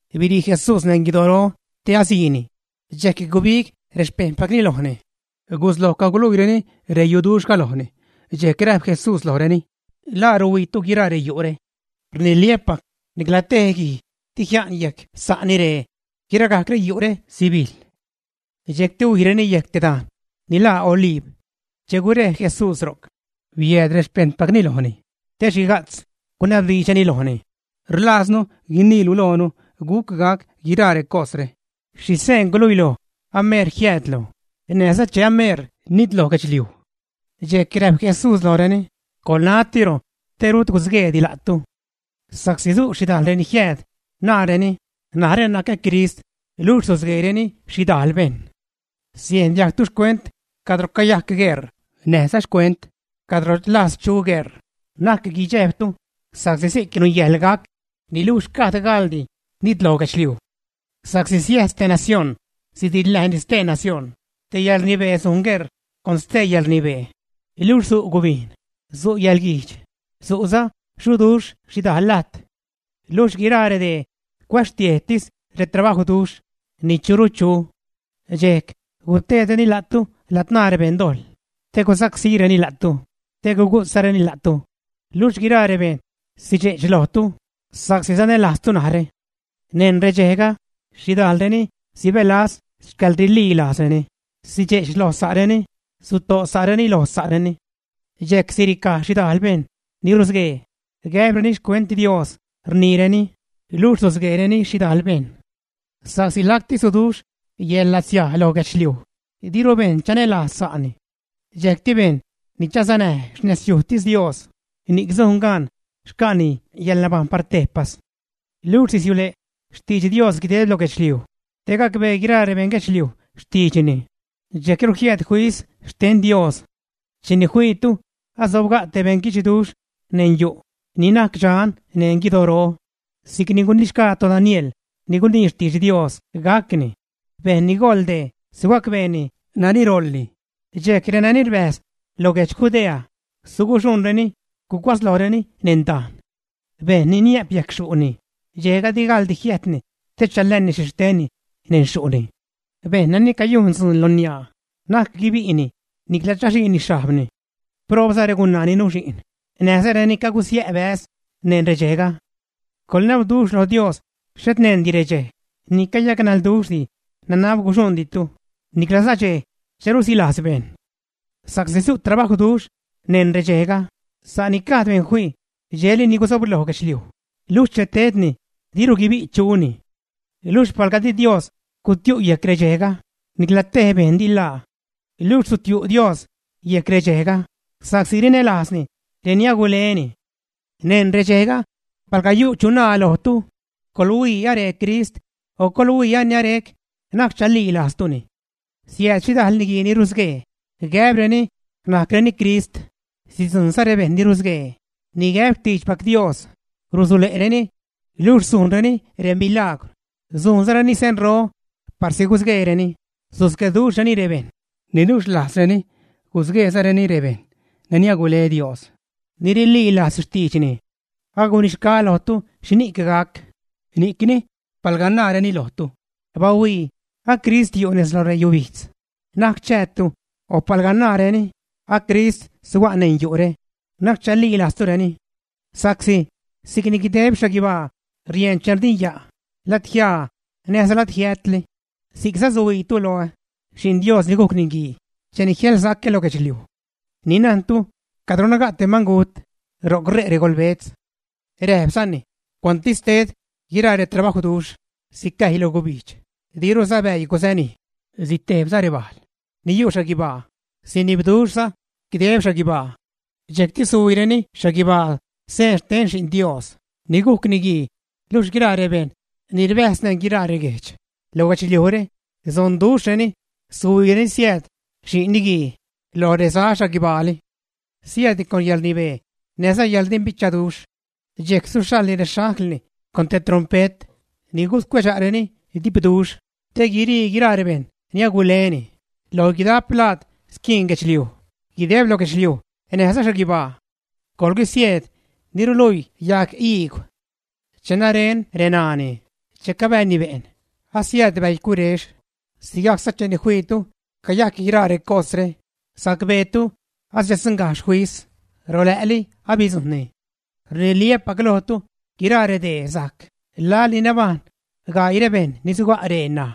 Birii Jesús neṉ guidoro te asiini, dxejc gubig rexpejṉpacni lojni, gusloj caguluiireni reyuduxhga lojni. Dxejc räjp Jesús lojreni: ―¿La ruhuiitu guiraa reyu're? Rniliä́pac nicla tej guij di jia'n yejc sa'ni ree; guiragajc reyu're sibijḻ. Dxejcti huijreni yejc te dajn ni laa Oliib. Che gurej Jesús ro'c, biääd rexpejṉpacni lojni te xhiga'tz gunabdiidxreni lojni: ―Rlaaznu guiniilu loonu guc gac guiraa recosre. ¿Xhi seen guluiloj ameer jiäädlu näjza che ameer nitloj guedxliuj? Dxejc räjp Jesús lojreni: ―¡Coḻnatiro te rut gusgueedi la'tu! Sa'csi su' xhidajl reni jiääd, naareni: “Narä nacä Crist”, luxh susgueereni xhidajl bejṉ. Siejn diajgtu xcuent cadro cayajc gueṟ, näjza xcuent cadro rlajz chu gueṟ, na'c guidxejbtu sa'csi si'c nungäjḻ gac, niluxh gajd gaḻdi nitloj guedxliuj. Sa'csi siäjs te nacióṉ sidiḻnäjni stee nacióṉ; te yäḻrnibee sujn gueṟ con stee yäḻrnibee, luxh su' gubijn, su' yäḻguijdx, su'za xuduxh xhidajl lajt. Luxh guiraa redee cuäxtiejtis retrabajwduxh ni churu chu. ’Dxejc guteedreni la'tu ladzṉaa rebeṉdojḻ te gusacsíreni la'tu, te gugu'tzareni la'tu, luxh guiraa rebejṉ sidxe'ch lojtu sa'csi sanälajztu narä. Neṉ redxejga, xhidajlreni sibälaz xcäḻrililajzreni, sidxe'ch lo sa'reni, suto' sa'reni lo sa'reni. Dxejc siricaj xhidajl bejṉ ni rusguee, gäbreni xcuent Dios rniireni, luxh susgueereni xhidajl bejṉ. Sa'csi lacti suduxh yäḻlatsiaj lo guedxliuj, diru bejṉ chanälajz sa'ni. Dxejcti bejṉ ni chasanäj xnezyujtis Dios, ni'c sun gaan xca'ni yäḻnabajṉ par tejpas. Luxh sisiule' xtidx Dios guideb lo guedxliuj te gacbee guiraa rebeṉ guedxliuj xtiidxni; dxejcru jiääd fis xten Dios. ’Cheni fiitu asobga' te beṉguidxduxh neṉ yu' ni najc dxan neṉ guidoro, si'cni gunixgaa toDaniel ni gunii xtidx Dios gacni, bejṉ ni goḻ dee sugacbeeni nani roḻni, dxejc renani rbäjz lo guedx Judea, suguxuṉreni gucuatzlojreni neṉ dajn. Bejṉ ni niä'p yejc xyu'ni dxejga di gaḻdi jiäjtni te chalääni xhixtenni neṉ xyu'ni; bejṉ nani cayujn dzuun lo niaa, na'c guibi'ni niclaza chaxhiini xhajbni. ¡Proobza regunaa ni nuxi'n, näjza reni cagusiä' bäz neṉ redxejga! Coḻnabduxh loj Dios xhet neṉdi redxej ni cayacnalduxhdi nanab guxuṉditu, niclaza dxej che rusilajz bejṉ. Sa'csi su' trabajwduxh neṉ redxejga, sa' ni gajd bejṉ fii dxejli ni guzobloj guedxliuj, luxh che tedni, diru guibi' chuni. Luxh palga di Dios gutiu' yejc redxejga, nicla tej bejṉ di ḻaa. Luxh sutiu' Dios yejc redxejga sa'csi rinälajzni reni aguleni. ’Neṉ redxejga palga yu' chu naa lojtu: “Coḻhuii, aree Crist”, o “Coḻhuii ani arec”, na'c chalilajztuni. Siääd xhidajl niguii ni rusguee, gäbreni najcreni crist; sidzujṉza rebejṉ ni rusguee ni gäb xtiidxpac Dios rusule'reni; luxh sujnreni remilagwr sujnzareni senro, parsi gusgueereni, susgueduxhreni rebejṉ, niluxh rlajzreni gusgueezareni rebejṉ ni agule Dios, ni rililajz xtiidxni. Agunixgaä lojtu xhini'c gac. Ni'cni palga naareni lojtu: “Bahuii, a crist yu' nez lo reyubijdz”, na'c chäätu; o palga naareni: “A crist suga' neṉ yu're”, na'c chalilajztureni. Sa'csi si'cni guideb xhaguibaa rieṉ che rdinya' ladjiaa näjza ladjiätli, si'cza suhuiitu loä, Xi'n Dios ni gujc Niguii, cheni jiälsacä lo guedxliuj. Ni najntu cadro naga' te mangut, ro'c ṟe' regolbetz. Räjpzani: ―Cuantsi ted guiraa retrabajwduxh, sicäjy lo gubijdx, diruza bäii gusanij, sitejbza rebajl ni yu' xhaguibaa, sinibduxhza guideb xhaguibaa. Dxejcti suhuiireni xhaguibaa seen xten Xi'n Dios ni gujc Niguii, luxh guiraa rebejṉ ni rbäjz neṉ guiraa reguejdx lo guedxliujre, sonduxhreni suhuiireni siääd Xi'n Niguii lo reza xhaguibaali. Siäädni con yäḻrnibee näjza yäḻrdimbichaduxh. Dxejc suxhaḻni rexanglni con te trompet ni guscuedxa'reni dipduxh te guire' guiraa rebejṉ ni aguleni lo guidajp lajd squiin guedxliuj, guideb lo guedxliuj näjza xhaguibaa. ’¡Coḻguisieed ni ruluii yajg iigw! Che naren reṉaani che cabääni be'n, asiääd bäi curex, sigajcza cheni fiitu cayajc guiraa recosre, sacbeetu asiädgajxh fis, rolä'li abidzujṉni. Rniliä́pac lojtu, guiraa redee sajc laḻ ni nabajṉ gaii rebejṉ ni suga' ree ṉaj.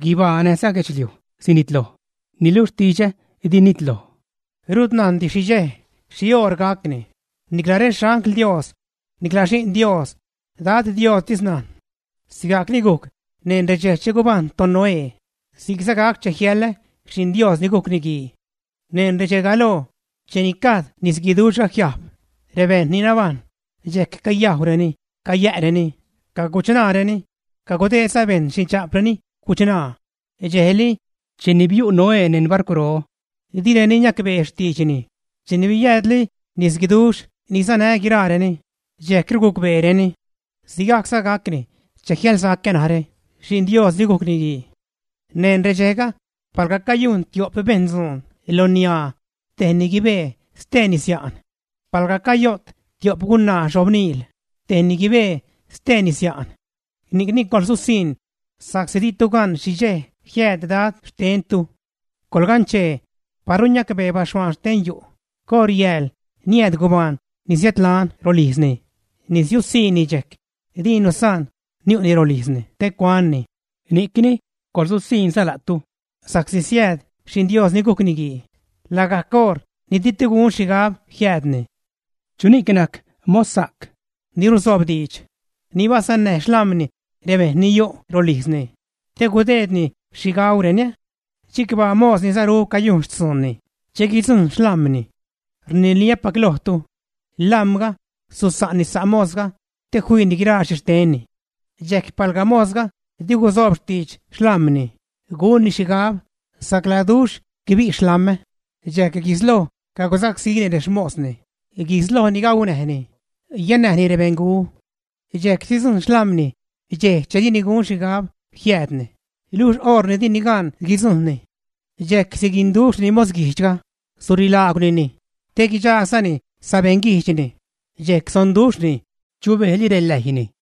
Guibaa näjza guedxliuj sinitloj, niluxh xtidxä di nitloj. ’Rut najndi xhi dxej, xhioṟ gacni, nicla rexangl Dios, niclaza Xi'n Dios; Dad Diostis najn. ’Sigajcni gujc neṉ redxej che gubajṉ toNoé, si'cza gac che jiälä Xi'n Dios ni gujc Niguii. Neṉ redxe galoo, cheni gajd nisguiduxhga jiajb, rebejṉ ni nabajṉ dxejc cayajwreni, cayä'reni, caguchṉaareni, cagudeedza bejṉ xindxa'preni guchṉaa, dxejli cheni biu' Noé neṉ barcwro. Direni niacbee xtiidxni; cheni biäädli nisguiduxh ni sanä guiraareni dxejcru gucbeereni. Sigajcza gacni che jiälsacä narä Xi'n Dios ni gujc Niguii. Neṉ redxejga palga cayujn tio'p bejṉ dzuun lo niaa tejni guibee, steeni sia'n. Palga cayo't tio'p gunaa xobniil, tejni guibee, steeni sia'n. ’Ni'cni coḻsusiṉ, sa'csi ditu gan xhi dxej jiääd Dad xtentu. Coḻganchee, paru niacbee baxhuaan xten yu' coṟ yääl niääd gubaan ni siädlan rolijzni, nisiusiṉni dxejc, dini nusaan niu'ni rolijzni te cuanni. Ni'cni coḻsusiṉza la'tu, sa'csi siääd Xi'n Dios ni gujc Niguii lagajc oṟ ni ditu gun xhigab jiäädni. ’¿Chuni'c najc mossa'c ni ruzoob diidx, ni basannäj xlam̲ni rebejṉ ni yu' rolijzni te gudeedni xhi gaureni ä? Chicbaa mos ni saru cayujn xtzuunni che guidzujṉ xlam̲ni. Rniliä́pac lojtu, lam̲ga susa'nni sa' mosga te fiini guiraa xhixtenni. Dxejc palga mosga di gusoob xtidx xlam̲ni, gunni xhigab: “Sacladuxh guibi' xlam̲ä”, dxejc guisloj cagusacsíni resamosni, guislojni gaunäjni, yänäjni rebeṉgu. Dxejc sidzujṉ xlam̲ni dxej che dini gun xhigab jiäädni, luxh oṟ ni dini gan guidzujṉni. Dxejc siguinduxhni mosguijdxga, surilaagwnini te guidxagsa'ni sabeṉguijdxni, dxejc sonduxhni, chubejli reläjyni.